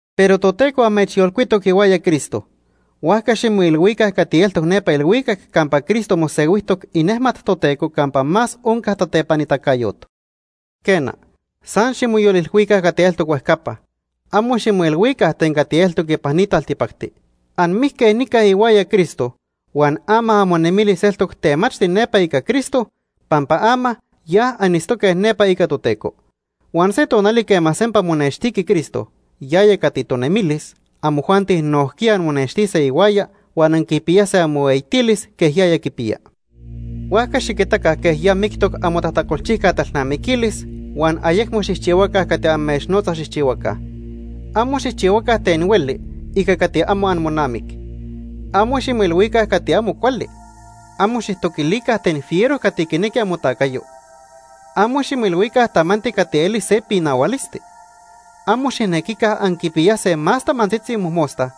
Pero Toteco amechyolcuitoc ihuaya Cristo, huajca ximoilhuica cati eltoc nepa ilhuicac campa Cristo mosehuijtoc inejmat Toteco campa más onca tatepanitacayot. Quena, san ximoyolilhuica cati eltoc huejcapa, amo ximoilhuica ten cati eltoc ipan ni taltipacti. Anmijque nica ihuaya Cristo huan ama amonemilis eltoc temachti nepa ica Cristo pampa ama ya anitztoque nepa ica Toteco. Huan se tonali quema sempa monextiqui Cristo, yaya cati tonemilis, amojuanti nojquiya anmonextise ihuaya huan anquipiyase amohueyitilis quej yaya quipiya. Huajca xiquitaca quej ya mictoc amotajtacolchijca talnamiquilis huan ayecmo xijchihuaca cati amechnotza xijchihuaca. Amo xijchihuaca ten hueli ica cati amo amonamic. Amo ximoilhuica cati amo cuali. Amo xijtoquilica ten fiero cati quinequi amotacayo. Amo ximoilhuica tamanti cati eli se pinahualisti. Amo xijnequica anquipiyase más tamantzitzi mojmosta,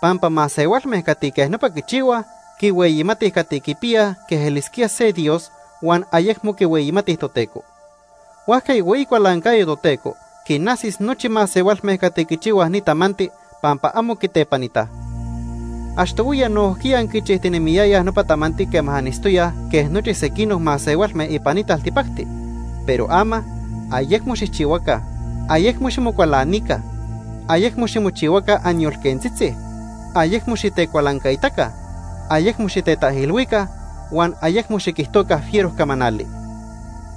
pampa masehualme cati quej nopa quichihuaj, quihueyimatij cati quipiyaj quej elisquía se dios huan ayecmo quihueyimatij Toteco. Huajca ihueyi cualancayo Toteco quinajsis nochi masehualme cati quichihuaj ni tamanti pampa amo quitepanitaj. Achtohuiya nojquiya anquichijtinemiyayaj nopa tamanti quema anitztoyaj quej nochi sequinoc masehualme ipan ni taltipacti. Pero ama, ayecmo xijchihuaca. Ayecmo ximocualanica, ayecmo ximochihuaca anyolquentzitzi, ayecmo xitecualancaitaca, ayecmo xitetaijilhuica, huan ayecmo xiquijtoca fiero camanali.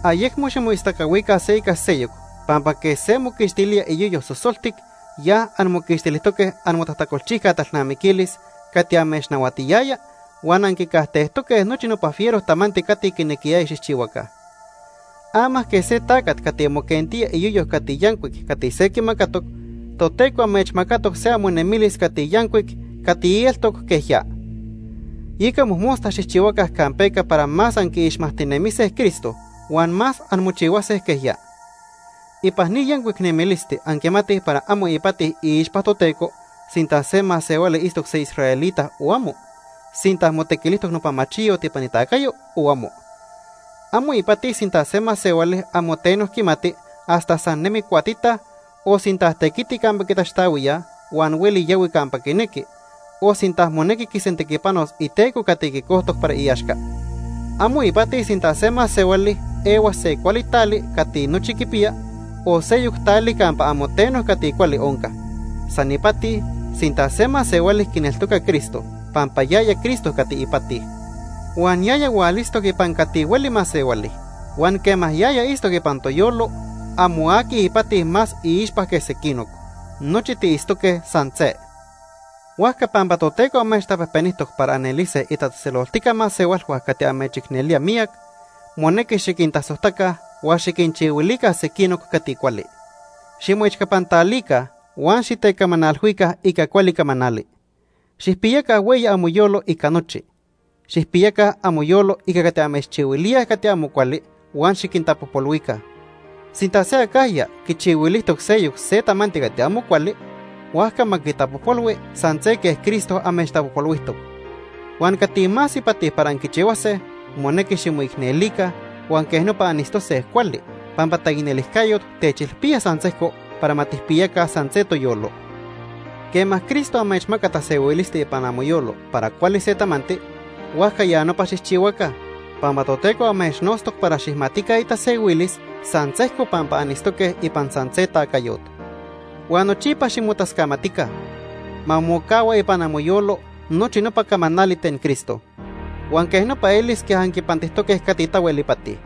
Ayecmo ximoistacahuica se ica seyoc pampa quej se moquixtilía iyoyo sosoltic, ya anmoquixtilijtoque amotajtacolchijca talnamiquilis cati amechnahuatiyaya huan anquicajtejtoque nochi nopa fiero tamanti cati quinequiyaya xijchihuaca. Ama quej se tacat cati moquentía iyoyo cati yancuic cati se quimacatoc, Toteco amechmacatoc se amonemilis cati yancuic cati eltoc quej ya. Yeca mojmosta xijchihuaca campeca para más anquiixmajtinemise Cristo huan más anmochihuase quej ya. Ipan ni yancuic nemilisti anquimatij para amo ipati iixpa Toteco sinta se masehuali itztoc se israelita o amo, sinta motequilijtoc nopa machiyot ipan itacayo o amo. Amo ipati sinta se masehuali amo teno quimati hasta san nemi cuatita, o sinta tequiti campa quitaxtahuíaj huan hueli yahui campa quinequi, o sinta monequi quisentequipanos iteco cati quicojtoc para iaxca. Amo ipati sinta se masehuali ehua se cuali tali cati nochi quipiya, o seyoc tali campa amo teno cati cuali onca. San ipati sinta se masehuali quineltoca Cristo, pampa yaya Cristo cati ipati. Huan yaya hualitztoc ipan cati hueli masehuali. Huan quema yaya itztoc ipan toyolo, amo aqui ipati más iixpa que sequinoc, nochi tiitztoque san se. Huajca pampa Toteco amechtapejpenijtoc para anelise itatzejtzeloltijca masehualhua cati amechicnelía miyac, monequi xiquintasojtaca huan xiquinchihuilica sequinoc cati cuali. Ximoechcapantalica huan xitecamanalhuica ica cuali camanali. Xijpiyaca hueyi amoyolo ica nochi. Xijpiyaca amoyolo ica cati amechchihuilíaj cati amo cuali huan xiquintapojpolhuica. Sinta se acajya quichihuilijtoc seyoc se tamanti cati amo cuali, huajca ma quitapojpolhui san se quej Cristo amechtapojpolhuijtoc. Huan cati más ipati para anquichihuase, monequi ximoicnelica huan quej nopa anitztose cuali, pampa taicnelijcayot techilpía san sejco para ma tijpiyaca san se toyolo. Quema Cristo amechmaca tasehuilisti ipan amoyolo para cuali se tamanti, huajca ya nopa xijchihuaca, pampa Toteco amechnotztoc para xijmatica itasehuilis san sejco pampa anitztoque ipan san se tacayot. Huan nochipa ximotascamatica. Ma mocahua ipan amoyolo nochi nopa camanali ten Cristo. Huan quej nopa elis quej anquipantijtoque cati tahuel ipati.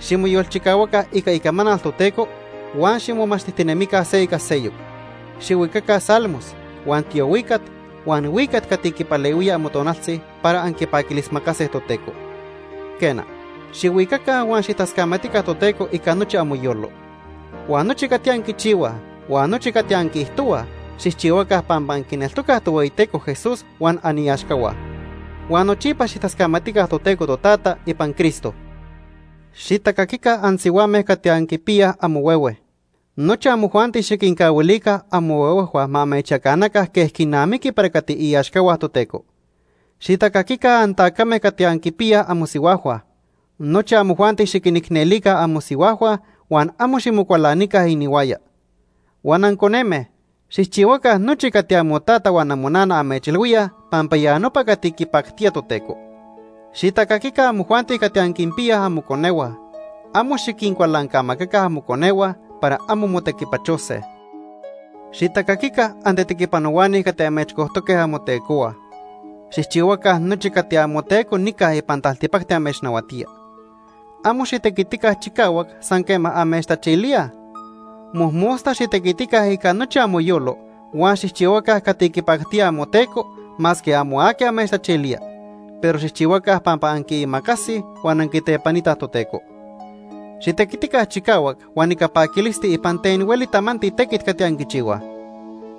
Ximoyolchicahuaca ica icamanal Toteco huan ximomachtijtinemica se ica seyoc. Xihuicaca salmos, huan tiohuicat, huan huicat cati quipalehuía amotonaltzi para anquipaquilismacase Toteco. Quena, xihuicaca huan xijtascamatica Toteco ica nochi amoyolo. Huan nochi cati anquichihuaj huan nochi cati anquiijtohuaj, xijchihuaca pampa anquineltocaj Tohueyiteco Jesús huan aniaxcahua. Huan nochipa xijtascamatica Toteco Totata ipan Cristo. Xitacaquica ansihuame cati anquipiyaj amohuehue. Nochi amojuanti xiquincahuilica amohuehuejhua ma amechyacanaca quej quinamiqui para cati iaxcahua Toteco. Xitacaquica antacame cati anquipiyaj amosihuajhua. Nochi amojuanti xiquinicnelica amosihuajhua huan amo ximocualanica inihuaya. Huan anconeme, xijchihuaca nochi cati amotata huan amonana amechilhuíaj pampa ya nopa cati quipactía Toteco. Xitacaquica amojuanti cati anquinpiyaj amoconehua. Amo xiquincualancamacaca amoconehua para amo motequipachose. Xitacaquica antetequipanohuani cati amechcojtoque amotecohua. Xijchihuaca nochi cati amoteco nica ipan taltipacti amechnahuatía. Amo xitequitica chicahuac san quema amechtachilíaj. Mojmosta xitequitica ica nochi amoyolo huan xijchihuaca cati quipactía amoteco masque amo aqui amechtachilía, pero xijchihuaca pampa anquiimacasij huan anquitepanitaj Toteco. Xitequitica chicahuac huan ica paquilisti ipan ten hueli tamanti tequit cati anquichihuaj.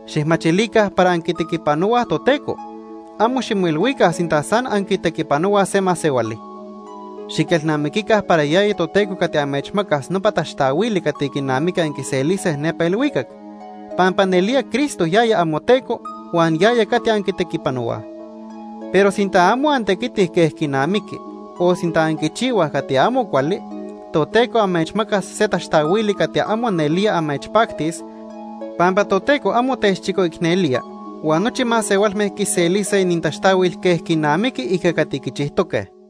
Xijmachilica para anquitequipanohuaj Toteco, amo ximoilhuica sinta san anquitequipanohuaj se masehuali. Xiquelnamiquica para yaya Toteco cati amechmacas nopa taxtahuili cati quinamiqui anquiselise nepa ilhuicac, pampa nelía Cristo yaya amoTeco huan yaya cati anquitequipanohuaj. Pero sinta amo antequitij quej quinamiqui o sinta anquichihuaj cati amo cuali, Toteco amechmacas se taxtahuili cati amo nelía amechpactis, pampa Toteco amo techchicoicnelía huan nochi masehualme quiselise inintaxtahuil quej quinamiqui ica cati quichijtoque.